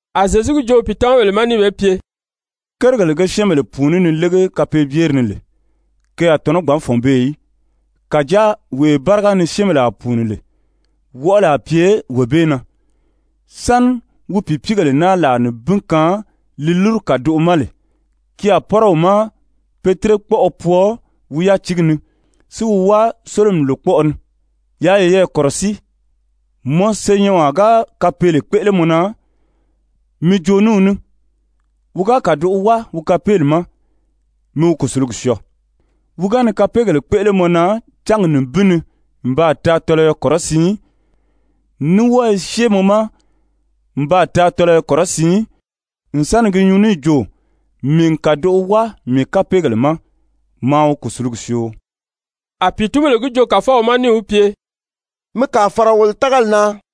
A Zyezu gi joo wi pìitamabèle ma níì be pye: «Kérigèle ge syɛ́ɛnbèle pùuní ni légi kapeebyeri ni lè, ke a tɔ̀nɔ́ gbǎn fɔ̀n beè í, kàjáa wee báriga ni syɛ́ɛnbèle a pùuni lè, wɔʔɔli a pye wee bee na. Sáni wi pìipiigèle naa làa nibin kaan li lúru kàdoʔo ma lè, ki a pɔ́rɔ wi ma pe tírekpɔʔɔ pwɔɔ wi yátiigi ni, si wi wáa sólomi lòkpɔʔɔ ni. Yaa yeyɛɛ kɔ̀rɔsíi. Mɔ senyɛnwaa ga kapeele kpéʔele mɔ na, mi jo ní wi ní, wi ga kàdoʔo wáa wi kapeeli ma, mi wi kùsulugi syɔɔ. Wi ga ni kapeegèle kpéʔele mɔ na cángi nibin ni n baa taa tɔlɔyɔ kɔrɔsiin, ní wɔ́ɔ i syée mɔ ma n baa taa tɔlɔyɔ kɔrɔsiin n sa ni gi nyuu níì jo: ‹Mii n kàdoʔo wáa mii kapeegèle ma, maa wi kùsulugi syoo.›» A pìitunbèle gi joo Kàfɔw ma níì wi pye: «Mi kàa fàra wolo tágali na.»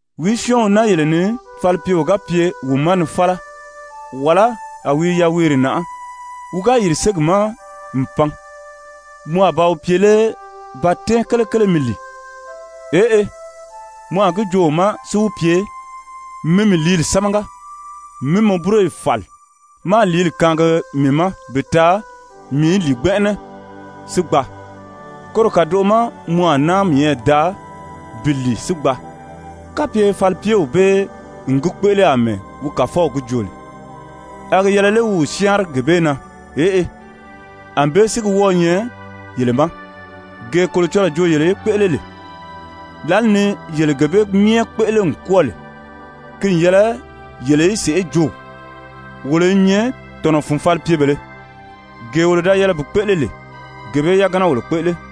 «Wìí syɔ́ɔn wi naa yele ni falipyeo ga pye wi ma ni fála, wàlá a wi i yaweere nàʔá, wi ga yìri ségi ma n pan, mɔ a ba wi pye lé: ‹Ba tɛ́ɛn kelekele mi lìi?› Eʔe, mɔ a gi joo wi ma si wi pye: ‹Mi mii lìíli sámaga, mí mɔ búroyi fàli máā lìíli kaangi mii ma bi taa mii í lìi gbɛnʔɛnɛ si gbaa, koro kàdoʔo ma mɔ a náa miyɛɛ daa bi lìi si gbaa.› Kapye falipyew bee n gi kpéʔele àmɛɛ wi kàfɔw jo lè, a gi yɛlɛ lé wi wi syáanri gee bee na? Eʔe. Anbée si gi wɔ́ɔ̄ nyɛ yele ma. Gee Kolocɔlɔɔ joo yele í kpéʔele lè, lǎli ni yele gee bee myɛ kpéʔele n kwɔ́ɔ lè, ki n yɛlɛ yele í sèʔé jo: ‹Wolo i nyɛ tɔ̀nɔ fun falipyebèlē, gee wolo da yɛlɛ bi kpéʔele lè, gee bee yagana wolo kpéʔele.›»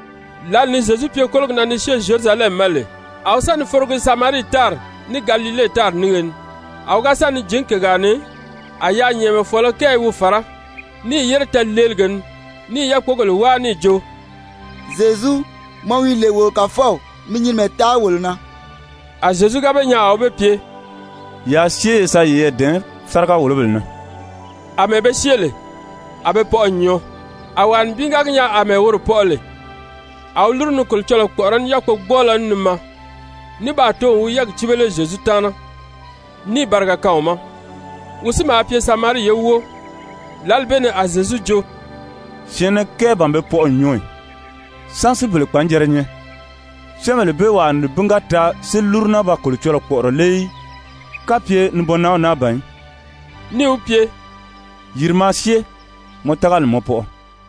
Lǎli ni Zyezu pye kólogi na ni syée Zyerusalɛmi ma lè, a wi sa ni forogi Samarii tári ní Galile tári nínge ni. A wi ga sa ni jǐn kègaa ni, a yaanyɛɛnmɛfɔɔlɔ kɛɛ i wi fàrá, níì yére tɛɛ̀leelige ni, ní i yákpogèle wáa níì jo: «Zyezu, mɔ wi lè wo Kàfɔw, mi nyinimɛ taa wolo na.» A Zyezu ga be nyaa a wi be pye: «Yaa syée ye sa yeyɛɛ dɛ̀ɛn sáriga-wòlobèle na.» Amɛɛ be syée lè, a be pɔʔɔ n nyɔɔ. A wàa nibin ga gi nyaa àmɛɛ woro pɔʔɔ lè, a wi lúru ni Kolocɔlɔɔ kpɔ̀ʔɔrɔ́ ní yákpogbɔɔlɔ ní ni maa, ní baa too n wi yɛ́ɛgi cíbele Zyezu taana, níì bariga kaan wi ma. Wi si maa pye Samarii ye wóo. Lǎli bee ni a Zyezu jo: «Syɛ̀ɛnnɛ kɛɛ ban be pɔʔɔ n nyɔɔ ì? Sán si bele kpanjɛrɛ nyɛ? Syɛ́ɛnbèle bee wàa nibin ga taa si lúru naa ba Kolocɔlɔɔ kpɔ̀ʔɔrɔ lé í, kapye nibɔnnanw naa ban í?» Níì wi pye: «Yìri maa syée, mɔ tágali n mɔ pɔʔɔ.»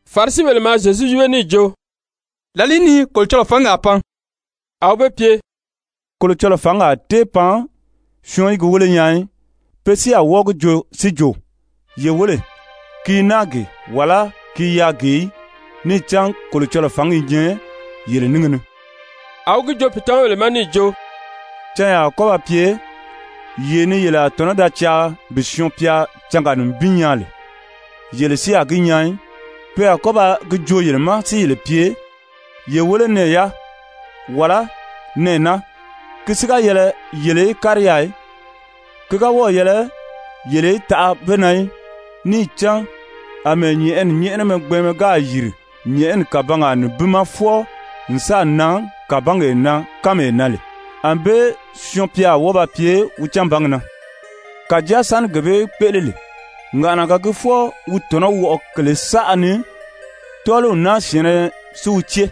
Farisibèle maa Zyezu yíbe níì jo: «Làlìí ni Kolocɔlɔɔ fǎngi a pan?» A wi be pye: «Kolocɔlɔɔ fǎngi a tée pan syɔɔn í gi wéle nyaa í. Pe si a wɔ́ɔ gi joo si jo: ‹Ye wéle, ki i naa gee,› wàlá ‹ki i yaà gee› í. Níì cán Kolocɔlɔɔ fǎngi i nyɛ yele níngi ni.» A wi gi joo pìitamabèle ma níì jo: «Canyaa a kɔ́ ba pye, yee ni yele a tɔ̀nɔ́ da caa bi Syɔɔn-pya cángaa nibin nyaa lè, yele si a gi nyaa í. Pe a kɔ́ ba gi joo yele ma si yele pye: ‹Ye wéle nɛɛ yaa,› wàlá ‹nɛɛ naa.› Ki si ga yɛlɛ yele í kári yaà í, ki ga wɔ́ɔ̀ yɛlɛ yele í taʔa be na í. Níì cán àmɛɛ nyɛ̀ʔɛni nyɛ́ʔɛnɛmɛ gbɛɛnmɛ gáà yiri nyɛ̀ʔɛni kàbangaa nibin ma fwɔɔ n sáà nan kàbangee na kánmee na lè, ànbée Syɔɔn-pya a wɔ́ɔ ba pye wi canbangi na. Kàjáa sáni gee bee í kpéʔele lè, ŋàʔanaga gii fwɔɔ wi tɔ̀nɔ́ wɔʔɔ kèlē saʔa ni, tɔ́ɔliw naa syɛ̀ɛnnɛ si wi cée.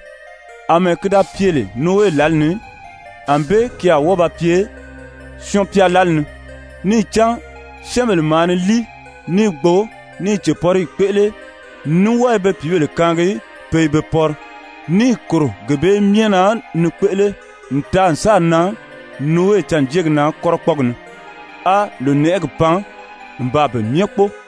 Amɛɛ ki da pye lè Nowe lǎli ni, ànbée ki a wɔ́ɔ ba pye Syɔɔn-pya lǎli ni. Níì cán syɛ́ɛnbèle maa ni líi, ní i gbo, ní i cèpɔrigi kpéʔele, ní wɔ́ɔ i be pìíbèle kaangi pe i be pɔri, níì kòro gee bee myɛ na ni kpéʔele n taa n sáà nan Nowe cânjeegi na kɔ́rɔkpɔɔgi ni. A lònɛʔɛgi pan n baa pe myɛ kpóo.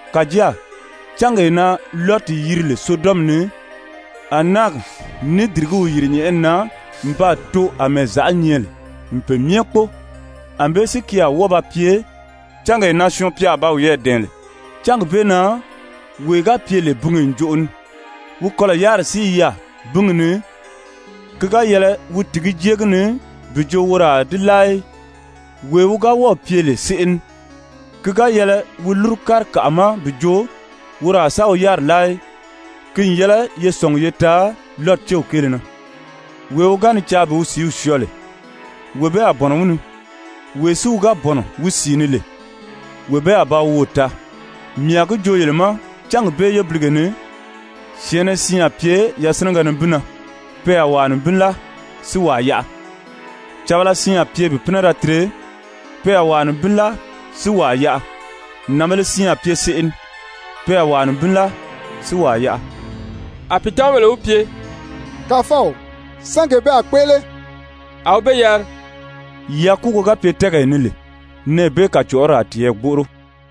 Kàjáa cángee na Lɔti yiri lè Sodɔmi ni, a náagi ní dìrigíw yìri nyɛ̀ʔɛni na n baa too àmɛɛ zàʔá nyɛ lè n pe myɛ kpóo. Anbée si ki a wɔ́ɔ ba pye cángee na Syɔɔn-pya a ba wiyɛɛ dɛ̀ɛn lè. Cángi bee na wee ga pye lè binge ǹjoʔo ni, wi kɔlɔ̀ yáriri si i yaà bíngi ni, ki ga yɛlɛ wi tìgí jée gi ni bi jo woro a di láa í. Wee wi ga wɔ́ɔ̀ pye lè seʔe ni, ki ga yɛlɛ wi lúru kári kàʔa ma bi jo woro a sa wi yáriri láa í. Ki n yɛlɛ ye sɔ̀ngi ye taa Lɔti céw kéele na. Wee wi ga ni caa bi wi sìíw syɔɔ lè, wee bee a bɔ̀nɔ wi ni. Wee si wi ga bɔ̀nɔ wi sìi ni lè, wee bee a ba wi woò taa. Mii a gi joo yele ma, cángi bee yébilige ni syɛ̀ɛnnɛ siin a pye yasinɛgɛ nibin na, pe a wàa nibin láa si wàa yaʔa. Càbala siin a pye bi pínɛ da tire, pe a wàa nibin láa si wàa yaʔa. [Nànbēle siin a pye seʔe ni, pe a wàa nibin láa si wàa yaʔa.]» A pìitamabèle wi pye: «Kàfɔw, sán gee bee a kpéʔele?» A wi be yari: «Yakuugo ga pye tɛ́ɛgee ni lè, nɛɛ bee kàcɔʔɔri a tiyɛɛ gbóʔoro.»